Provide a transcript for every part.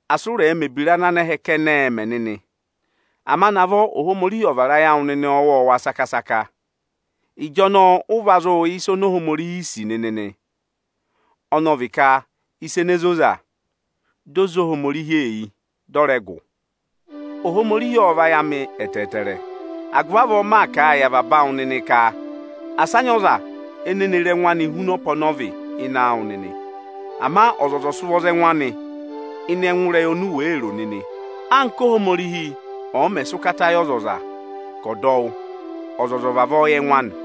Asị ụ rẹ̀ mẹ̀ ebira ana anẹhẹẹ̄ kẹnẹ mẹ nịnị! Ama navọ Ohomorihi ọ̀ vara ayị awụ nịnị ọwọọwa saka-saka! Ịjọnọọ ụ va zụụ yẹ ịsa oni Ohomorihi sì nịnị nị, ọnọọ vị ka ịsa ene zoza, di o zé Ohomorihi eyi, dị ọ rẹ gụ. Ohomorihi ộ vayị amị ẹtẹẹtẹrẹ, agụvị avọọ maa kà a yị avaba awụ nịnị ka: Asị a nyị ọza ene ne re ẹngụ anị huna ọpa ọnọọ vị ịnị awụ nịnị! Ama ọzọza ọ̀ sị ụvọ za ẹngụ anị ịnị ẹngụ ịrẹyị oni u wèe ro nịnị! Anka Óhomorihi ọ̀ọ mẹ̀ sị ụkata yị ọzọza ka ọ̀ dọ wụ́, ọzọza ọ̀ vavọọ yẹ ẹngụ anị!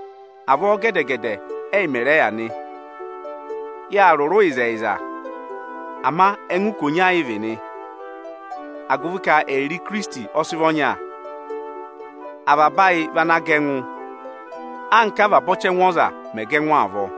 Avọọ gẹdẹ-gẹdẹ ẹ́yị mẹ̀ rẹ yà nị. Yâ rụrụ ịzẹyịza, ama ẹngụ ikonya ị vị nị, agụvị ka ẹyịrị Ikirisiti ọ sị vị ọnya. Avaba ayị vị ana gẹ ẹngụ, anka avaba ọchẹngụ ọza mẹ̀ gẹ ẹngụ avọọ.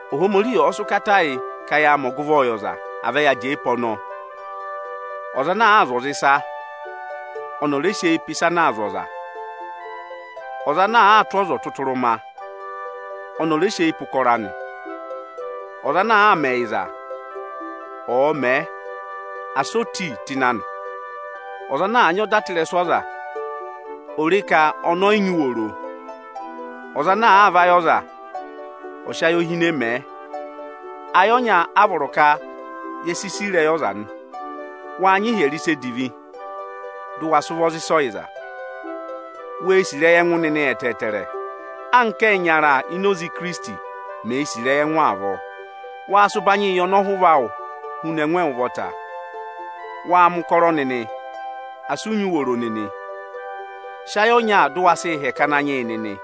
Ohomorihi ọ̀ọ sị ụkata yị ka yaa mẹ ọgụvọọ yị ọza, à vẹ ya jẹẹ pe ọnọọ! Ọza ana àa zụ̀ aza ịsa, ọnị ọ̀ rẹ sị eyi pe ịsa ana aa zụ̀ aza! Ọza ana àa tụ́ ọza ọtụtụrụma, ọnị ọ̀ rẹ sị eyi pe ụkọrọ anị! Ọza ana àa mẹ ẹyịza, ọ̀ọ mẹẹ, asị o ti tụ́ ịnị anị! Ọza ana àa nyị ọda tụra ịrẹsụ aza, ò re ka ọnị ọyị nyị uworo! Ọza ana àa vayị ọza, ọ̀ọ sị ayohinee mẹẹ! Ayị ọnya a vọrọ ka ye sii sì ịrẹyị ọza nị. Waa nyị ịhyẹrẹ ịsa edivi, dụ wa sị ụvọ za ịsa ọyịza. Wee sì ịrẹyị ẹngụ nịnị ẹtẹẹtẹrẹ, anka ẹyịnyara ini Ikirisiti meē sì ịrẹyị ẹngụ avọọ. Waa sị ụbanyịị yị ọnọhụva awụ huna ẹngụ awụ ụvọta. Waa mẹ̀ ụkọrọ nịnị, asị ụ nyị uworo nịnị. Sị ayị ọnya dụ wa sịị hẹkẹ Ananyị yị nịnị.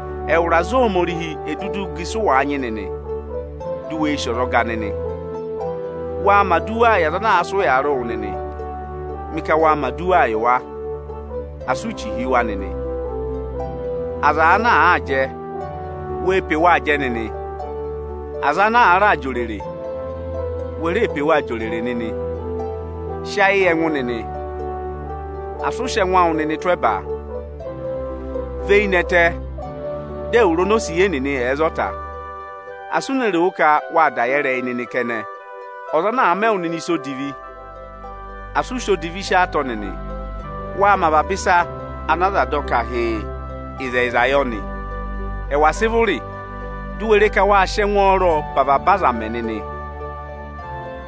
Ẹwụrị aza Ohomorihi è duduu gà ịsụ wàa nyị nịnị, dụ wee sì ọzọga nịnị. Waa mẹ̀ aduwaa yị aza ana aa sị ụyaa rị wụ nịnị. Mị ka waa mẹ̀ aduwaa yị wa, asị u chì hi wa nịnị. Aza ana àaa jẹ, wee pe waa jẹ nịnị! Aza ana àaa raa jị òrèrè, we ree pe waa jị òrèrè nịnị. Sị ayị yị ẹngụ nịnị. Asị ụ sị ẹngụ awụ nịnị tụ́ ẹba. Và eyi nẹtẹ, dị ẹwụrị onosiye nịnị ẹ̀ẹ za ọta. Asị u ne roo ka wâ da yẹ ịrẹyị nịnị kẹnẹ. Ọza ọ̀ọ mẹ wụ nịnị ịsa odivi, asị u sị odivi sí ọọ atọ nịnị! Waa mẹ avaba ịsa ana aza dọ ka hịịn, ịzẹyịza yọ nị! Ẹwà sị vụrị di u we re ka waa sị ẹngwọọrọ pe avaba azaa mẹ nịnị!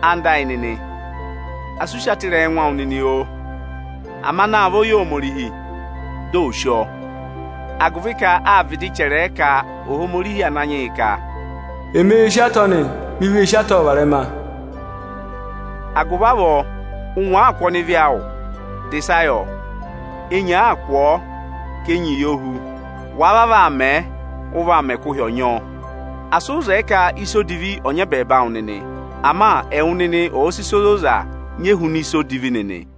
Ẹwụ nịnị ẹyịnyara amị, asị u sí atọ ịrẹyị ẹngụ awụ nịnị, oo! Ama naavọ yị Ohomorihi, di ò sí ọọ, agụvị ka â vịdị chẹrẹẹ ka Ohomorihi Ananyị yị ka, “Emeē sí atọ nị, mi vee sí atọọ varẹma.” Agụvị avọọ, ụngwẹ àaa kụ̀ ọnịvị awụ, dà ịsa yọ! Enyi àaa kụ̀ ọọ, ká enyi yọ hú. Wàa vavọọ aa mẹẹ, ụ vaa mẹ ka ụhị ọ̀ọ nyị ọọ. Asị ụ zẹẹ ka ịsa odivi ọ̀ nyị ẹbẹẹba awụ nịnị; ama ẹwụ nịnị ọ̀ sị ịsa ozoza nyị ehuna ịsa odivi nịnị!